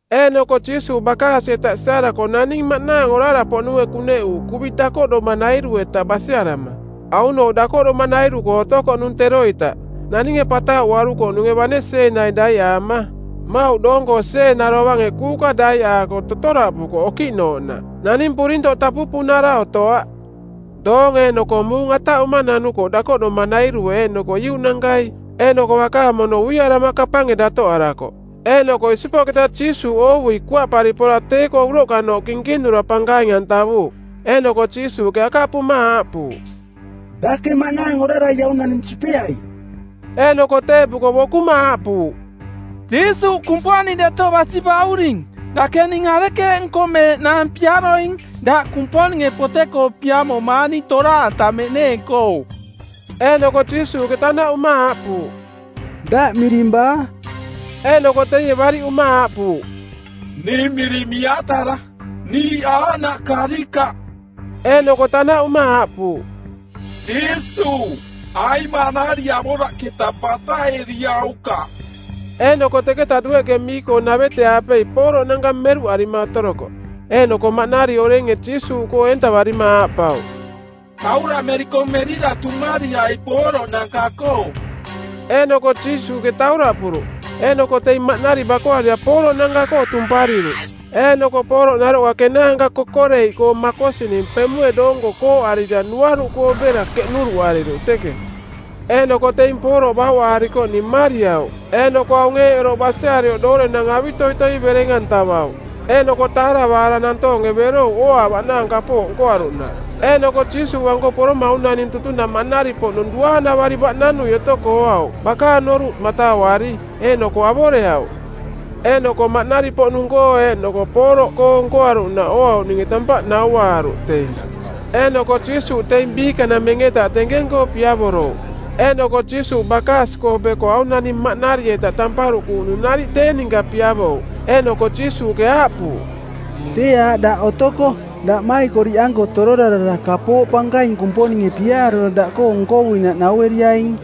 Eeꞌnoko Jiisuuꞌ bakaasi-eta siarako naning maꞌnaang orara-poꞌnunge kuneꞌuuꞌ kuvi dakoꞌdomanairu-eta basiarama. Aunooꞌ dakoꞌdomanairu-koo otokoꞌnung teroita. Naninge patauꞌuarukoꞌnunge bane sieenai daiꞌaama. Mmauꞌ doong-koo sieena dovange kuuka daiꞌaako totoraꞌpukoꞌ okiꞌnooꞌnaꞌ. Naning purintoꞌ tapupunara otoaꞌ. Doong eeꞌnoko muung ataꞌuma nanukoꞌ dakoꞌdomanairue eeꞌnoko iuꞌnankai. Eeꞌnoko bakaang mono uiarama kapange datoꞌarakoꞌ. Eeꞌnoko isipoꞌketa Jiisuuꞌ oovui kuaꞌpari pora tee-koo uroꞌkanooꞌ kinkinura pankaing-antavuuꞌ. Eeꞌnoko Jiisuuꞌke akaꞌpuma aaꞌpuuꞌ, “Dake maꞌnaang orarai aung naning sipeai.” Eeꞌnoko teeꞌpuko bokuma aaꞌpuuꞌ, “Jiisuuꞌ, Kumponing Deto Basi Bauring, dake ning arekeeꞌ nkomeeꞌnaang piaroing? Daꞌ Kumponinge pote-koo piamomaang ning toraꞌantameꞌneeng-koo.” Eeꞌnoko Jiisuuꞌke tanaꞌuma aaꞌpuuꞌ, “Daꞌ miring baa?” Eeꞌnoko teie bariꞌuma aaꞌpuuꞌ, “Ning miring Miatara. Niiꞌ aaꞌnaꞌ karikaꞌ.” Eeꞌnoko tanaꞌuma aaꞌpuuꞌ, “Jiisuuꞌ, aing maꞌnari avoraꞌketa bataꞌeriaukaꞌ.” Eeꞌnoko teketa dueꞌke mii-koo navete-aapei pooroꞌnanka meruꞌarima otorokoꞌ. Eeꞌnoko maꞌnari orenge Jiisuuꞌkoo eentavarima aaꞌpauꞌ, “Tauraꞌmeriko merira tumariai pooroꞌnanka-koo.” Eeꞌnoko Jiisuuꞌke tauraꞌpuruꞌ. Eeꞌnoko teing maꞌnari bakoarira pooroꞌnanka-koo tumpariruꞌ. Eeꞌnoko pooroꞌ naroꞌka kenaanka kokoreiꞌkoo˜ makosining pemue doonko kooꞌarira nuaruꞌkoo bera keꞌnuruꞌariruꞌ teke. Eeꞌnoko teing pooroꞌ bauꞌaarikoꞌning mmariauꞌ eeꞌnoko aung eeꞌ oroꞌ basiarioꞌ doorenang avitoitoi bereng-antavauꞌ. Eeꞌnoko taaravaara nantoonge berouꞌ ooaavaꞌnaang kapooꞌ nkoaruꞌnaꞌ. Eeꞌnoko Jiisuuꞌanko poroma aung naning tutunaꞌ maꞌnari-poꞌnung duaanavari baꞌnanui otoko ooauꞌ bakaang noruꞌ matauari, eeꞌnoko avoreauꞌ. Eeꞌnoko maꞌnari-poꞌnung-koo eeꞌnoko pooroꞌkoo nkoaruꞌnaꞌ ooauꞌninge tampaꞌ nauaaruꞌ teing. Eeꞌnoko Jiisuuꞌ teing biikanameng-eta tenkeng-koo piavorouꞌ. Eeꞌnoko Jiisuuꞌ bakaasi-koo beko aung naning maꞌnari-eta tamparuꞌkuuꞌnung nariꞌ tee ninka piavouꞌ. Eeꞌnoko Jiisuuꞌke aaꞌpuuꞌ, “Tee aaꞌ daꞌ otoko. Daꞌmaikoriꞌanko tororarara kapooꞌ pankaing Kumponinge piaarura daꞌkoo nkovuinaꞌ naueriaing.”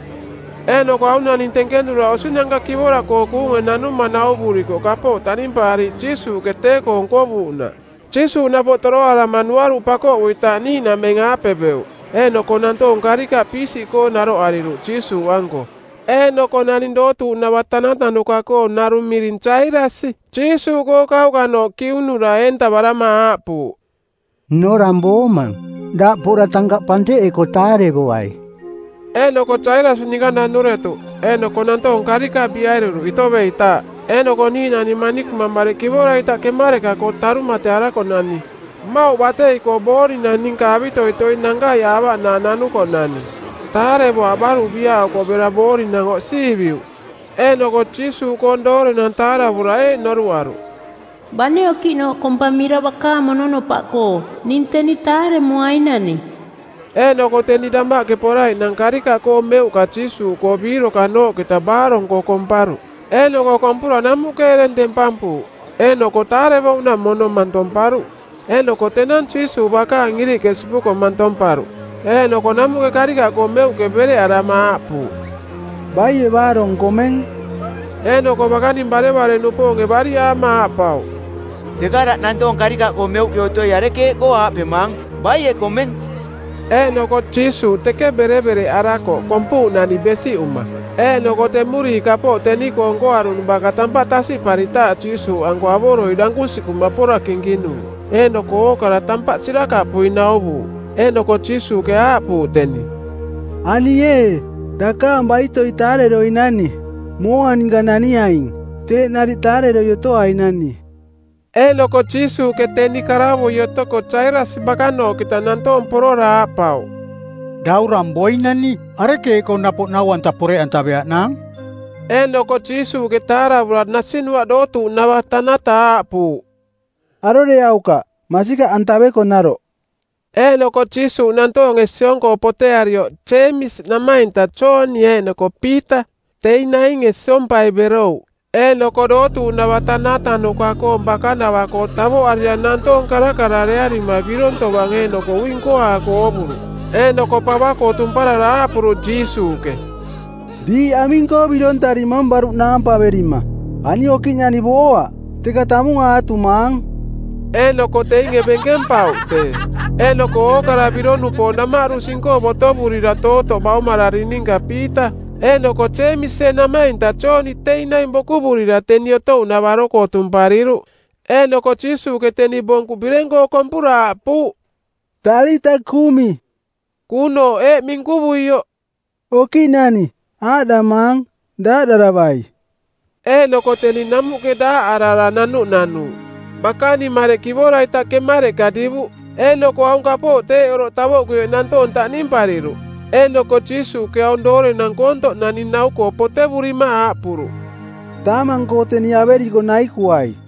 Eeꞌnoko aung naning tenkenura osinanka kivora-koo kuunge nanuma nauvurikoꞌ kapooꞌ taꞌnimpaariiꞌ Jiisuuꞌke tee-koo nkovuuꞌnaꞌ. Jiisuuꞌ napoꞌ toroarama nuaruꞌ pakoꞌuitaaꞌ niiꞌnameng-aape beuꞌ, eeꞌnoko nantoong karikaꞌ piisiꞌkoo naroꞌariruꞌ Jiisuuꞌanko. Eeꞌnoko naning dootuuꞌnava tantanuka-koong narung miring Jairasi Jiisuuꞌkoo kauꞌkanooꞌ kiunura eentavarama aaꞌpuuꞌ, “Nnorang boomang. Daꞌ pora tankaꞌ panteꞌeko taarevoai.” Eeꞌnoko Jairasi ninka nanuretuꞌ. Eeꞌnoko nantoong karikaꞌ biꞌariruꞌ itoveitaaꞌ. Eeꞌnoko niiꞌnani manikuma otokoꞌ mareꞌ kivora-ita kemareꞌka-koo tarumatearakoꞌnani, mmauꞌ batei-koo boorinang ninka avitoitoi nankaiꞌaavaꞌnaang nanukoꞌnani. Taarevoaꞌ baruꞌ biaꞌokoꞌ bera boorinang oꞌsiiviuꞌ. Eeꞌnoko Jiisuuꞌkoong doorenang taaravura eeꞌ noruꞌaruꞌ, “Bane okiꞌnooꞌ kompamira bakaang mononopaꞌkoo, ning teni taaremoainani.” Eeꞌnoko teni damaꞌke poraiꞌnang karikaꞌkoo meuꞌka Jiisuuꞌkoo biirokanooꞌketa baarong-koo komparuꞌ. Eeꞌnoko kompura namuꞌke ereng tempampuuꞌ eeꞌnoko taarevouꞌnaꞌ mono mantomparuꞌ. Eeꞌnoko tenang Jiisuuꞌ bakaang iriꞌke sipuko mantomparuꞌ, eeꞌnoko namuꞌke karikaꞌkoo meuꞌke berevereꞌarama aaꞌpuuꞌ, “Baie baarong komeng?” Eeꞌnoko bakaning barevare-nupoonge bariꞌaama aaꞌpauꞌ, “Teka daꞌ nantoong karikaꞌkoo meuꞌke otoi arekeeꞌkoo aaꞌpemaang, ‘Baie komeng?’” Eeꞌnoko Jiisuuꞌ teke berevereꞌarakoꞌ kompuuꞌnani besiꞌuma. Eeꞌnoko temuriiꞌ kapooꞌ teni-koo nkoaruꞌnung baka tampaꞌ tasiꞌparitaaꞌ Jiisuuꞌanko avoroi dankusiꞌkuma pora kinkinuuꞌ eeꞌnoko ookara tampaꞌ sirakaꞌpui nauvuuꞌ. Eeꞌnoko Jiisuuꞌke aaꞌpuuꞌ teniꞌ, “Ani ee, daꞌ dakaang baitoi taareroinani. Mooa ninka naniaing. Teeꞌ nariꞌ taareroi otoainani.” Eeꞌnoko Jiisuuꞌke teni karavui otoko Jairasi bakanooꞌketa nantoong porora aaꞌpauꞌ, “Daurang boinani. Arekeeꞌkoo napoꞌ Nau-anta poreꞌantaveaꞌnaang?” Eeꞌnoko Jiisuuꞌke taaravura nasinuaꞌ dootuuꞌnava tanata aaꞌpuuꞌ, “Aroreaukaꞌ, masikaꞌantaveko naroꞌ!” Eeꞌnoko Jiisuuꞌ nantoonge siong-koo potearioꞌ Jeemisi namainta Jooni eeꞌnoko Piita, teing nainge siompai berouꞌ. Eeꞌnoko dootuuꞌnava tanatanuka-koong bakanavaꞌkoo tavoꞌarira nantoong karakararearima birong tovang eeꞌnoko ui nkoaako oovuruꞌ. Eeꞌnoko pava-koo tumparara aaꞌpuruꞌ Jiisuuꞌke, “Diiꞌ aming-koo birontarimang baruꞌ naampaverima? Ani okiꞌnani booaꞌ, teka tamung aatumaang.” Eeꞌnoko teinge benkempauꞌ tee. Eeꞌnoko ookara birong-nupoong damaꞌdu sing-koo botovurira tootoꞌ baumararing ninka Piita eeꞌnoko Jeemisie namainta Jooni teing naing bokuvurira teni otouꞌnavaro-koo tumpariruꞌ. Eeꞌnoko Jiisuuꞌke teni bonkuꞌ bireng-koo kompura aaꞌpuuꞌ, “Talita kumi.” Kuunooꞌ eeꞌ minkuvuioꞌ, “Okiꞌnani, aaꞌdamaang: Daaꞌdaravai.” Eeꞌnoko teni namuꞌke daaꞌarara nanuꞌnanuuꞌ. Bakaning mareꞌ kivora-ita kemareꞌka divuꞌ. Eeꞌnoko aung kapooꞌ teeꞌ oroꞌ tavoꞌkuioꞌ nantoong taꞌnimpariruꞌ. Eeꞌnoko Jiisuuꞌke aung doorenang koontoꞌ naning nau-koo potevurima aaꞌpuruꞌ, “Taamang-koo teni averiko naikuai.”